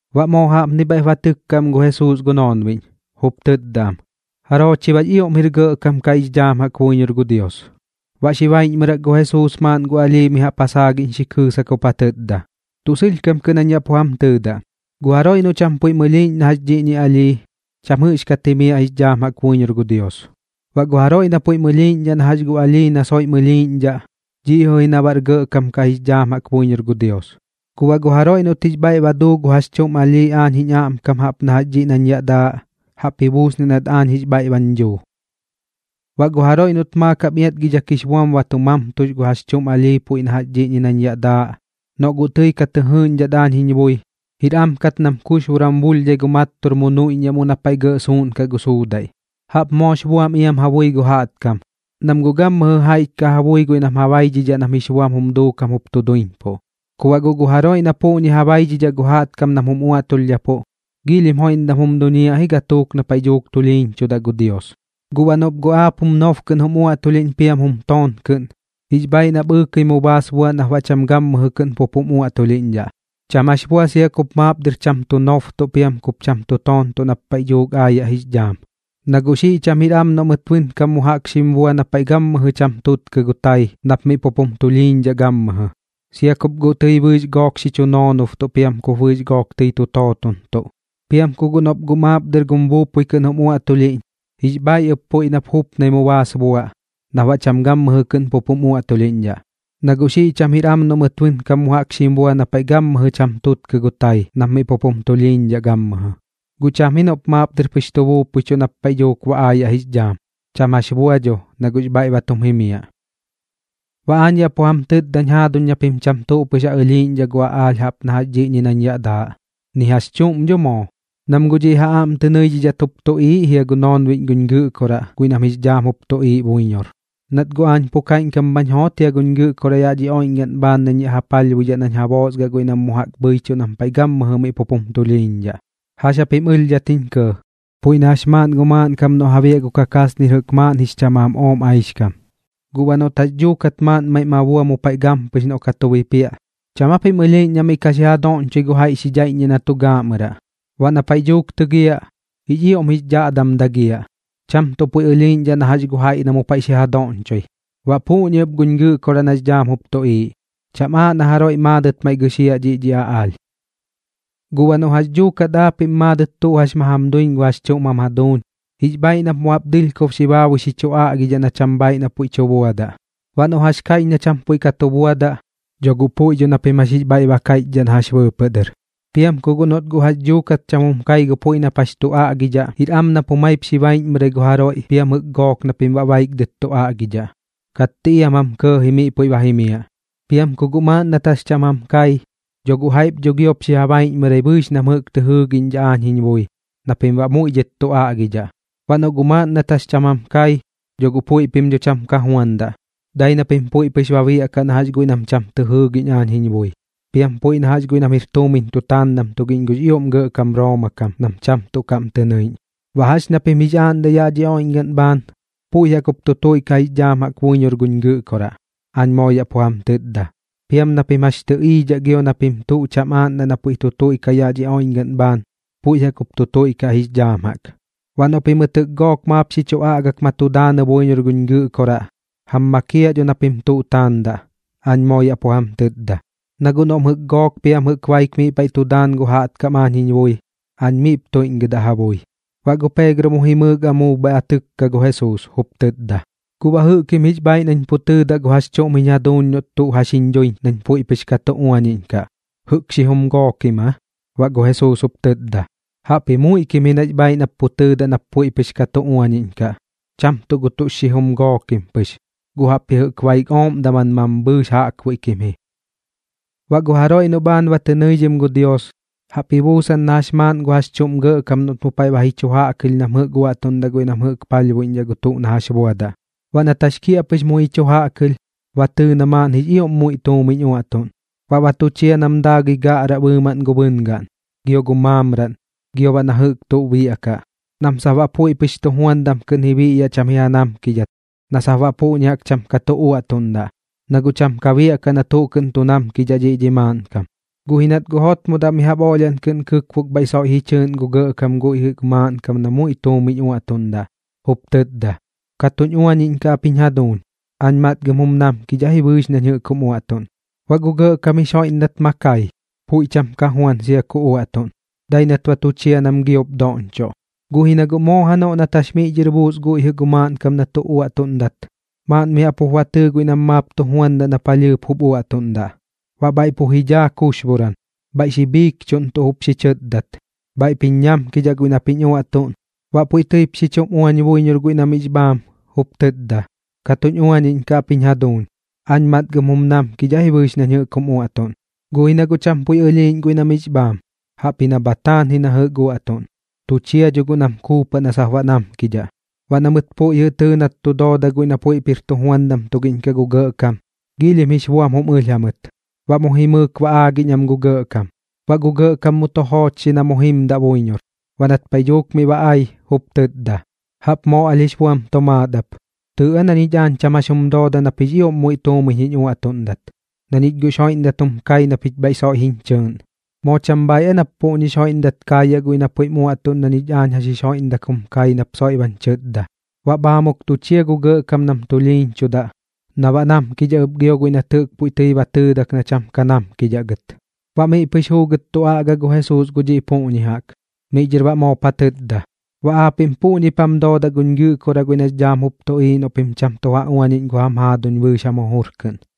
Baꞌ moo jaꞌpni bhaiꞌp ba tɨkka am gu Jesuus gu noonbiꞌñ, jup tɨtda am: ―¿Jaroo chi baꞌx ioꞌm jir gɇꞌkam kaꞌ jix dhaam jaꞌk buiñor gu Dios? Baꞌ xi baiꞌñmɨrak gu Jesuus maaꞌn gu alhii mi jaꞌp ja saagiꞌñ xi kɨɨsak jup ja tɨtda: ―Tuꞌ sɨlhkam kɨꞌn jañ yaꞌ pu jam tɨtda, gu jaroiꞌ noꞌ cham puiꞌm ɨlhiiꞌñ na jax dhiꞌñi alhii, cham jɨꞌxkat jimiaꞌ jix dhaam jaꞌk buiñor gu Dios. Baꞌ gu jaroiꞌ na puiꞌm ɨlhiiꞌñdhaꞌ na jax gu alhii na soiꞌm ɨlhiiꞌñdhaꞌ, dhiꞌ jɨꞌ ji na bar gɇꞌkam kaꞌ jix dhaam jaꞌk buiñor gu Dios. Guꞌ baꞌ gu jaroiꞌ noꞌt jix bhaiꞌ ba duu gu jax chuꞌm alhii aañ jiñ aꞌmkam jaꞌp na jax dhiꞌñi nañ yaꞌ daaꞌ, jaꞌp ji buusniaꞌ nat aañ jix bhaiꞌ bañ dhuu. ’Baꞌ gu jaroiꞌ noꞌt maakam iatgidhak jix buam ba tu mamtux gu jax chuꞌm alhii puiꞌ na jax dhiꞌñi nañ yaꞌ daaꞌ, noꞌ guꞌ tɨi ka tɨ jɨɨꞌñdhat aañ jiñ bui, jir am kat nam kuxboran buulhdhai gu mattur mu nuiꞌññaꞌ mu paiꞌ na gɇꞌ suuꞌnkaꞌ gu suudaiꞌ. Jaꞌp moox buam iam ja bui gu jaꞌtkam, nam guꞌ gammɨjɨ jaiꞌch kaꞌ ja bui guiꞌ nam ja baidhidhaꞌ nam jix buam jum duukam jup tu duiñpuꞌ. Ku baꞌ guꞌ gu jaroiꞌ na puꞌñi ja baidhidhaꞌ gu jaꞌtkam nam jum uꞌuaꞌtulhdhapuꞌ, giilhim joiꞌmdam jum duñiaꞌ ji gatuuk na paiꞌ dhuuk tulhiiñchudaꞌ gu Dios. ’Guꞌ baꞌ noꞌp guꞌ aap gum nob kɨꞌn jum uaꞌtulhiꞌñ piam gum toon kɨꞌn, jix bhaiꞌ nap ɨɨkɨi mu baas buaꞌ nap baꞌ cham gammɨjɨ kɨꞌn pup jum uaꞌtulhiꞌñdhaꞌ, cham jax bua sia kup maap dɨr cham tu nobtuꞌ piam kup cham tu toontuꞌ nap paiꞌ dhuuk ba aayaꞌ jix dhaam. Na guꞌ xiꞌ cham jir am noꞌ mɨt guꞌ bɨnkam mu jaꞌk xim bua na paiꞌ gammɨjɨ cham tutkɨ gu tai nap miꞌ pup jum tulhiiñdhaꞌ gammɨjɨ, sia kup bɨɨx gook tɨi xi chu noonobtuꞌ piam kup bɨɨx gook tɨi tu tootontuꞌ. Piam ku guꞌ noꞌp guꞌ maap dɨr gum buupui kɨꞌn jup jum uaꞌtulhiꞌñ, jix bhaiꞌ ɨp puiꞌ nap jupnai mu baas buaꞌ nap baꞌ cham gammɨjɨ kɨꞌn pup jum uaꞌtulhiꞌñdhaꞌ. Na guꞌ xiꞌ cham jir am noꞌ mɨt bɨnkam mu jaꞌk xim bua na paiꞌ gammɨjɨ cham tutkɨ gu tai nap miꞌ pup jum tulhiiñdhaꞌ gammɨjɨ. Guꞌ cham ji noꞌp maap dɨr pɨx tu buupuichuꞌ nap paiꞌ dhuuk ba aayaꞌ jix dhaam, cham jax bua, na guꞌx bhaiꞌ ba tum jimiaꞌ. ’Baꞌ aañ yaꞌ pu jam tɨtdañ jaaduñ na pim cham tuꞌ pɨx ja ɨlhiiꞌñdhaꞌ gu aꞌaalh jaꞌp na jax dhiꞌñi nañ yaꞌ daaꞌ, ni jax chuꞌm dho moo, nam guꞌ dhiꞌ ja aꞌm tɨ nɨidhat jup tuꞌiiꞌ jia gu noonbiꞌñ guñ Gɨꞌkoraꞌ guiꞌ nam jix dhaam jup tuꞌiiꞌ buiñor. Nat guꞌ aañ pu kaiꞌñkam bhañ joot jia guñ Gɨꞌkoraꞌ yaꞌ dhi oiꞌñgaꞌn bhaan nañ yaꞌ ja palhbuidhaꞌ nañ ja boosgaꞌ guiꞌ nam jɨꞌk mu jaꞌk bhɨichuꞌ nam paiꞌ gammɨjɨ miꞌ pup jum tulhiiñdhaꞌ. ’¿Jax japim ɨlhdhat jiñ kɇɇ? Puiꞌ na jax maaꞌn gu maaꞌnkam noꞌ ja biaꞌ gu kakasnir jɨꞌk maaꞌn jix chamaam ooꞌm aix kam. Guꞌ baꞌ noꞌt guꞌ jax dhuukat maaꞌn maiꞌ ma bua mu paiꞌ gampɨx noꞌ ka tu bipiaꞌ, ¿cham japim ɨlhiiꞌñ na miꞌ ka xi ja doꞌñchoi gu jaiꞌ xi dhaiꞌññiaꞌ na tu gaaꞌmɨraꞌ? Baꞌ na paiꞌ dhuuk tɨgiaꞌ, jix ioꞌm jix dhaꞌdam dagiaꞌ, cham tuꞌ puiꞌ ɨlhiiꞌñdhaꞌ na jax gu jaiꞌ na mu paiꞌ xi ja doꞌñchoi. Baꞌ puꞌñi ɨp guñ Gɨꞌkoraꞌ nax dhaam jup tuꞌiiꞌ, cham aaꞌ na jaroiꞌ maadɨt maiꞌ gɨxiaꞌ dhiꞌ dhi aꞌaalh. ’Guꞌ baꞌ noꞌ jax dhuukat aapiꞌm maadɨt tuꞌ jax ma jam duiñ gu jax chuꞌm jam jaduuñ, jix bhaiꞌ nap mu jaꞌp dɨlhkob xi baabui xi chu aꞌgidhaꞌ na cham bhaiꞌ na puiꞌ tu buadaꞌ. Baꞌ noꞌ jax kaiꞌch na cham puiꞌ ka tu buadaꞌ, dho guꞌ puiꞌ dho na pim jax jix bhaiꞌ ba kaiꞌchdhaꞌ na jax bɨɨpɨꞌ dɨr. Piam ku guꞌ noꞌt guꞌ jax dhuukat cham jum kai gu puiꞌ nap jax tu aꞌgidhaꞌ, jir am nap jumaip xi baiꞌñmɨrai gu jaroiꞌ piam jɨꞌk gook na pim baꞌ baik dɨt tu aꞌgidhaꞌ, katti iam jam kɇɇji miꞌ puiꞌ ba jimiaꞌ. Piam ku guꞌ maaꞌn nat jax cham jam kai, dho guꞌ jaiꞌp dho giop xi ja baiꞌñmɨrai bɨɨx nam jɨꞌk tɨ jɨɨgiꞌñdhaꞌ aañ jiñ bui na pim baꞌ muiꞌ dhɨt tu aꞌgidhaꞌ. Baꞌ noꞌ guꞌ maaꞌn nat jax cham jam kai, dho guꞌ puiꞌp dho cham ka juandaꞌ, dai nap puiꞌ pɨx ba biaꞌkaꞌ na jax guiꞌ nam cham tɨ jɨɨgiꞌñ aañ jiñ bui, piam puiꞌ na jax guiꞌ nam jir tuumiñ tu taandam tugiꞌñ gux ioꞌm gɇꞌkam Rooma kam nam cham tuꞌ kaꞌm tɨ nɨiꞌñ. ’Baꞌ jax ña pim jix aaꞌndaꞌ yaꞌ dhi oiꞌñgaꞌn bhaan, puiꞌ jaꞌk jup tu tuiꞌkaꞌ jix dhaam jaꞌk buiñor guñ Gɨꞌkoraꞌ, aañ moo yaꞌ pu jam tɨtda. Piam na pim jax tɨꞌiidhaꞌ gio na pim tuꞌ cham aaꞌndaꞌ na puiꞌ tu tuiꞌkaꞌ yaꞌ dhi oiꞌñgaꞌn bhaan, puiꞌ jaꞌk jup tu tuiꞌkaꞌ jix dhaam jaꞌk. ’Baꞌ noꞌ pimɨt jɨꞌk gook maap xi chu aꞌgak ma tu daanɨ buiñor guñ Gɨꞌkoraꞌ, jam makiaꞌ dho na pim tuꞌ taandaꞌ, aañ moo yaꞌ pu jam tɨtda. Na guꞌ noꞌm jɨꞌk gook piam jɨꞌk baik miꞌ paiꞌ tu daan gu jaꞌtkam aañ jiñ bui, aañ miꞌp tuiꞌñgɨdaꞌ ja bui. Baꞌ gu Peegro mu jimɨɨk amuub bhaiꞌ ba tɨkka gu Jesuus, jup tɨtda: ―¿Guꞌ baꞌ jɨꞌkim jix bhaiꞌ nañ pu tɨɨdaꞌ gu jax chuꞌm jiñ jaduuñ noꞌt tuꞌ jax jiñ duiñ nañ puiꞌ pɨx ka tu uañiꞌñkaꞌ, jɨꞌk xijum gookim aa? Baꞌ gu Jesuus jup tɨtda: ―Jaꞌpji muiꞌ kim ji nax bhaiꞌ nap pu tɨɨdaꞌ nap puiꞌ pɨx ka tu uañiꞌñkaꞌ, cham tuꞌ gu tuꞌ xijum gookim pɨx, guꞌ jaꞌpji jɨꞌk baik ooꞌm daman mambhɨɨx jaꞌkbuiꞌ kim ji. ’Baꞌ gu jaroiꞌ noꞌ bhaan ba tɨ nɨidhim gu Dios, jaꞌp ji buusan na jax maaꞌn gu jax chuꞌm gɇꞌkam noꞌt mu paiꞌ ba ji chu jaꞌkɨlh nam jɨꞌk uaꞌtuꞌndaꞌ guiꞌ nam jɨꞌk palhbuiꞌñdhaꞌ gu tuꞌ na jax buadaꞌ. Baꞌ nat jax kiaꞌpɨx muiꞌ ji chu jaꞌkɨlh, ba tɨɨ na maaꞌn jix ioꞌm muiꞌ tuumiñ uaꞌtuꞌn. Baꞌ ba tu chia nam daagɨi gaꞌraꞌ bɨɨmaꞌn gu bɨngaꞌn, gio gu maamraꞌn, gio baꞌ na jɨꞌk tuꞌ biaꞌkaꞌ, nam sap baꞌ puiꞌ pɨx tujuandam kɨꞌn ji biꞌyaꞌ cham ji namkidhat na sap baꞌ puꞌñi jaꞌk cham ka uaꞌtuꞌndaꞌ, na guꞌ cham biaꞌkaꞌ na tuꞌ kɨꞌn tu namkidhaꞌ dhiꞌ dhi maaꞌnkam. Guꞌ ji nat guꞌ jotmodaꞌ mi jaꞌp oꞌlhiaꞌn kɨꞌn xi kɨkbok bhaiꞌ soiꞌ ji chɨɨꞌn gu gɇꞌkam guiꞌ jɨꞌ gu maaꞌnkam na muiꞌ tuumiñ uaꞌtuꞌndaꞌ, jup tɨtda: “Ka tuñ uañiꞌñkaꞌ ap jiñ jaduuñ. Aañ matgɨm jum namkidhaꞌ ji bɨɨx nañ jɨꞌk jum uaꞌtuꞌn.” Baꞌ gu gɇꞌkam jix joiꞌmdak ma kai, puiꞌ cham ka juan sia ku uaꞌtuꞌn, dai nat ba tu chia nam giop doꞌñchoꞌ. Guꞌ ji na guꞌ moo janoꞌ nat jax miꞌ dhɨr buus guiꞌ jɨꞌ gu maaꞌnkam na tu uaꞌtuꞌndat, maaꞌn mi jaꞌp jup ba tɨɨ guiꞌ nam maap tu juandaꞌ na palhɨɨp jup uaꞌtuꞌndaꞌ. Baꞌ bhaiꞌ pu ji dhaa kuxboran, bhaiꞌ xi bhiikchuꞌntuꞌ jup xi chɨtdat: “Bhaiꞌp jiñ ñamkidhaꞌ guiꞌ nap jiñ uaꞌtuꞌn.” Baꞌ puiꞌ tɨip xi chum uañ buiñor guiꞌ na miꞌx bhaam, jup tɨtda: “Ka tuñ uañiꞌñkaꞌ ap jiñ jaduuñ. Aañ matgɨm jum namkidhaꞌ ji bɨɨx nañ jɨꞌk jum uaꞌtuꞌn.” Guꞌ ji na guꞌ cham puiꞌ ɨlhiiꞌñ guiꞌ na miꞌx bhaam, jaꞌpji na bha taan ji na jɨꞌk uaꞌtuꞌn. Tu chia dho guꞌ nam kuupaꞌ na sap baꞌ namkidhaꞌ. Baꞌ na mɨt puiꞌ jɨꞌ tɨɨ nat tu dooda guiꞌ nam puiꞌp jir tujuandam tugiꞌñ kaꞌ gu gɇꞌkam, giilhim jix buam jum ɨlh jamɨt, baꞌ mu jimɨɨk ba aagiꞌñ am gu gɇꞌkam. Baꞌ gu gɇꞌkam mu tu joochxi na mu jimdaꞌ buiñor. Baꞌ nat paiꞌ dhuuk miꞌ ba ai, jup tɨtda: “Jaꞌp moo alh jix buam tomaat ap. Tɨɨꞌ aa na ñich aañ cham jax jum dooda nap jix ioꞌm muiꞌ tuumiñ jiñ uaꞌtuꞌndat, na ñich guꞌx joiꞌmdak jum kai na pich bhaiꞌ soiꞌ jiñ chɨɨꞌn. ¿Moo cham bhaaiꞌ aa nap puꞌñix joiꞌmdaip kaayaꞌ guiꞌ na puiꞌm uaꞌtuꞌn na ñich aañ jax xim joiꞌmdak jum kai nap soiꞌ bañ chɨtda?” Baꞌ bhaamuk tu chia gu gɇꞌkam nam tulhiiñchudaꞌ na baꞌ namkidhaꞌ ɨp gio guiꞌ nat jɨꞌk puiꞌ tɨi ba tɨɨdak na cham ka namkidhaꞌ gɨt. Baꞌ miꞌ pɨx juugɨt tu aꞌga gu Jesuus gu dhiꞌ puꞌñi jaꞌk. Miꞌ dhɨr baꞌ moop ja tɨtda: ―Baꞌ aapiꞌm puꞌñip jam doodaꞌ guñ Gɨꞌkoraꞌ guiꞌ nax dhaam jup tuꞌiiꞌ noꞌ pim cham tu ja uañiꞌñ gu jam jaaduñ bɨɨx jam jujur kɨꞌn.